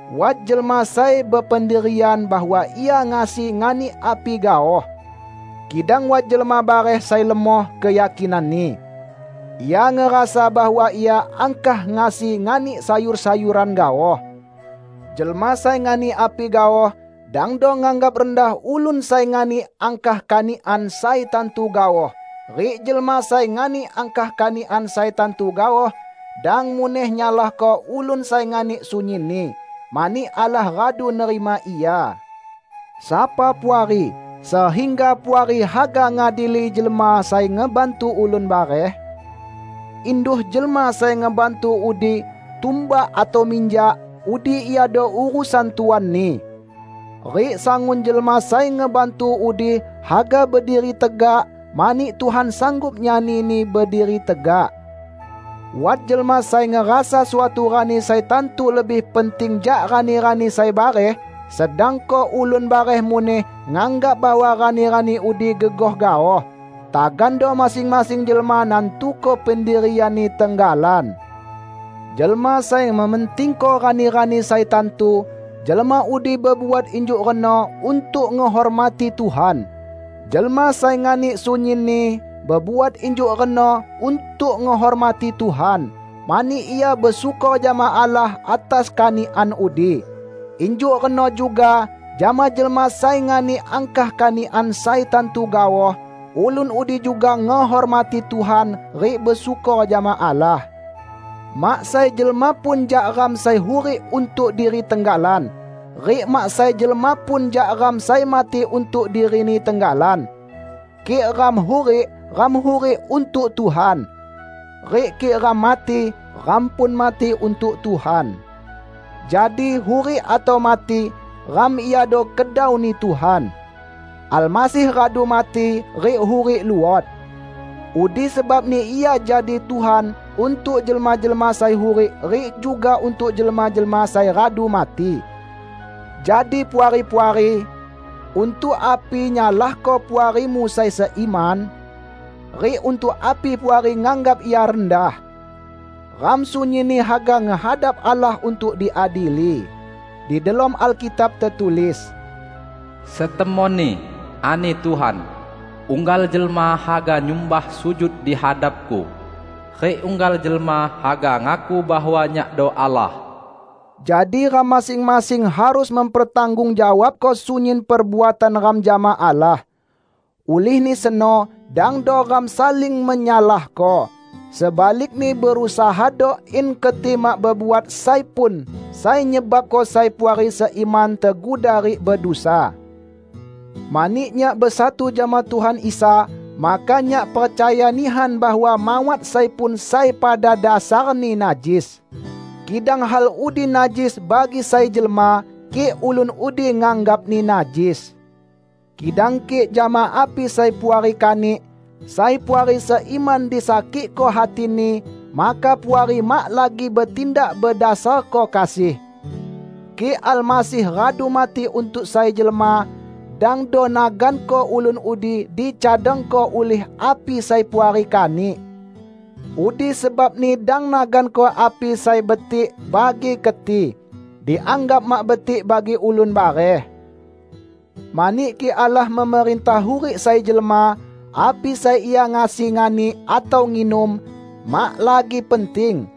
Wat jelma sai bependirian bahwa ia ngasi nganik api gaoh. Kidang wat jelma bareh sai lemoh keyakinanni; ia ngerasa bahwa ia angkah ngasi nganik sayur-sayuran gaoh. Jelma sai nganik api gaoh dangdo nganggap rendah ulun sai nganik angkah kanikan sai tantu gaoh; rik jelma sai nganik angkah kanikan sai tantu gaoh, dang muneh nyalahko ulun sai nganik sunyinni, mani Allah radu nerima ia. Sapa Puari sehingga Puari haga ngadili jelma sai ngebantu ulun bareh? Induh jelma sai ngebantu udi tumbak atau minjak, udi iado urusan tuanni. Rik sangun jelma sai ngebantu udi haga berdiri tegak, mani Tuhan sanggup nyanini berdiri tegak. Wat jelma sai ngerasa suatu rani sai tantu lebih penting jak rani-rani sai bareh, sedangko ulun bareh muneh nganggap bahwa rani-rani udi gegoh gaoh. Tagando masing-masing jelma nantuko pendirianni tenggalan. Jelma sai mementingko rani-rani sai tantu, jelma udi bebuat injuk reno untuk ngehormati Tuhan. Jelma sai nganik sunyinni, bebuat injuk reno untuk ngehormati Tuhan, mani ia besyukor jama Allah atas kanikan udi. Injuk reno juga jama jelma sai nganik angkah kanikan sai tantu gaoh; ulun udi juga ngehormati Tuhan rik besyukor jama Allah. Mak sai jelma pun jak ram sai hurik untuk diri tenggalan; rik mak sai jelma pun jak ram sai mati untuk dirini tenggalan. Kik ram hurik, ram hurik untuk Tuhan. Rik kik ram mati, ram pun mati untuk Tuhan. Jadi hurik atau mati, ram iado kedau-Ni Tuhan. Almasih radu mati rik hurik luot. Udi sebabni Ia jadi Tuhan untuk jelma-jelma sai hurik rik juga untuk jelma-jelma sai radu mati. Jadi Puari-puari! Untuk api nyalahko puarimu sai seiman? Rik untuk api Puari nganggap ia rendah? Ram sunyinni haga ngehadap Allah untuk diadili. Di delom Alkitab tetulis, "Setemonni," ani Tuhan, "unggal jelma haga nyumbah sujud di hadap-Ku; rik unggal jelma haga ngaku bahwa Nyakdo Allah." Jadi ram masing-masing harus mempertanggungjawabko sunyin perbuatan ram jama Allah. Ulihni seno dangdo ram saling menyalahko. Sebalikni berusahado in keti mak bebuat sai pun sai nyebabko sai puari seiman teguda rik bedusa. Mani nyak besatu jama Tuhan Isa, maka nyak percaya nihan bahwa mawat sai pun sai pada dasarni najis; kidang hal udi najis bagi sai jelma, kik ulun udi nganggapni najis. Kidang kik jama api sai Puari kanik, sai puari seiman disakikko hatini, maka Puari mak lagi betindak bedasarko kasih. Kik Almasih radu mati untuk sai jelma, dangdo naganko ulun udi dicadangko ulih api sai Puari kanik. Udi sebabni dang naganko api sai betik bagi keti, dianggap mak betik bagi ulun bareh. Mani kik Allah memerintah hurik sai jelma, api sai ia ngasi nganik atau nginum, mak lagi penting.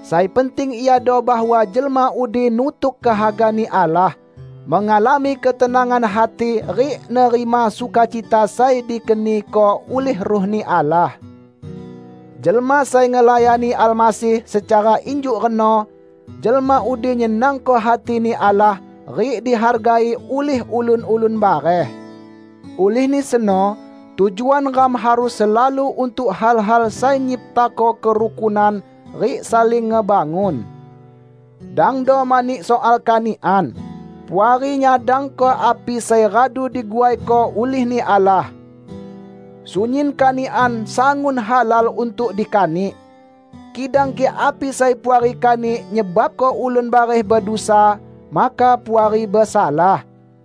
Sai penting iado bahwa jelma udi nutuk kehaga-Ni Allah, mengalami ketenangan hati rik nerima sukacita sai dikeniko ulih Ruh-Ni Allah. Jelma sai ngelayani Almasih secara injuk reno, jelma udi nyenangko hati-Ni Allah, rik dihargai ulih ulun-ulun bareh. Ulihni seno tujuan ram harus selalu untuk hal-hal sai nyiptako kerukunan rik saling ngebangun. Dangdo mani soal kanikan, Puari nyadangko api sai radu diguaiko ulih-Ni Allah. Sunyin kanikan sangun halal untuk dikanik; kidang kik api sai Puari kanik nyebabko ulun bareh bedusa, maka Puari besalah.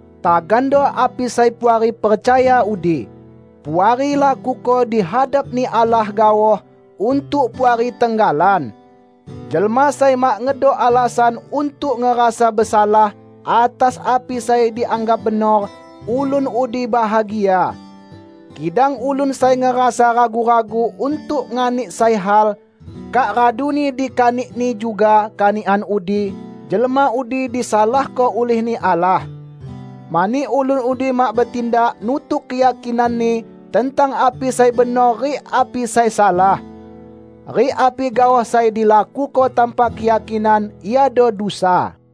Tagando api sai Puari percaya udi, Puari lakuko di hadap-Ni Allah gaoh untuk Puari tenggalan. Jelma sai mak ngedok alasan untuk ngerasa besalah atas api sai dianggap benor, ulun udi bahagia. Kidang ulun sai ngerasa ragu-ragu untuk nganik sai hal, kak raduni dikanikni juga kanikan udi, jelma udi disalahko ulih-Ni Allah; mani ulun udi mak betindak nutuk keyakinanni tentang api sai benor rik api sai salah. Rik api gaoh sai dilakuko tanpa keyakinan iado dusa.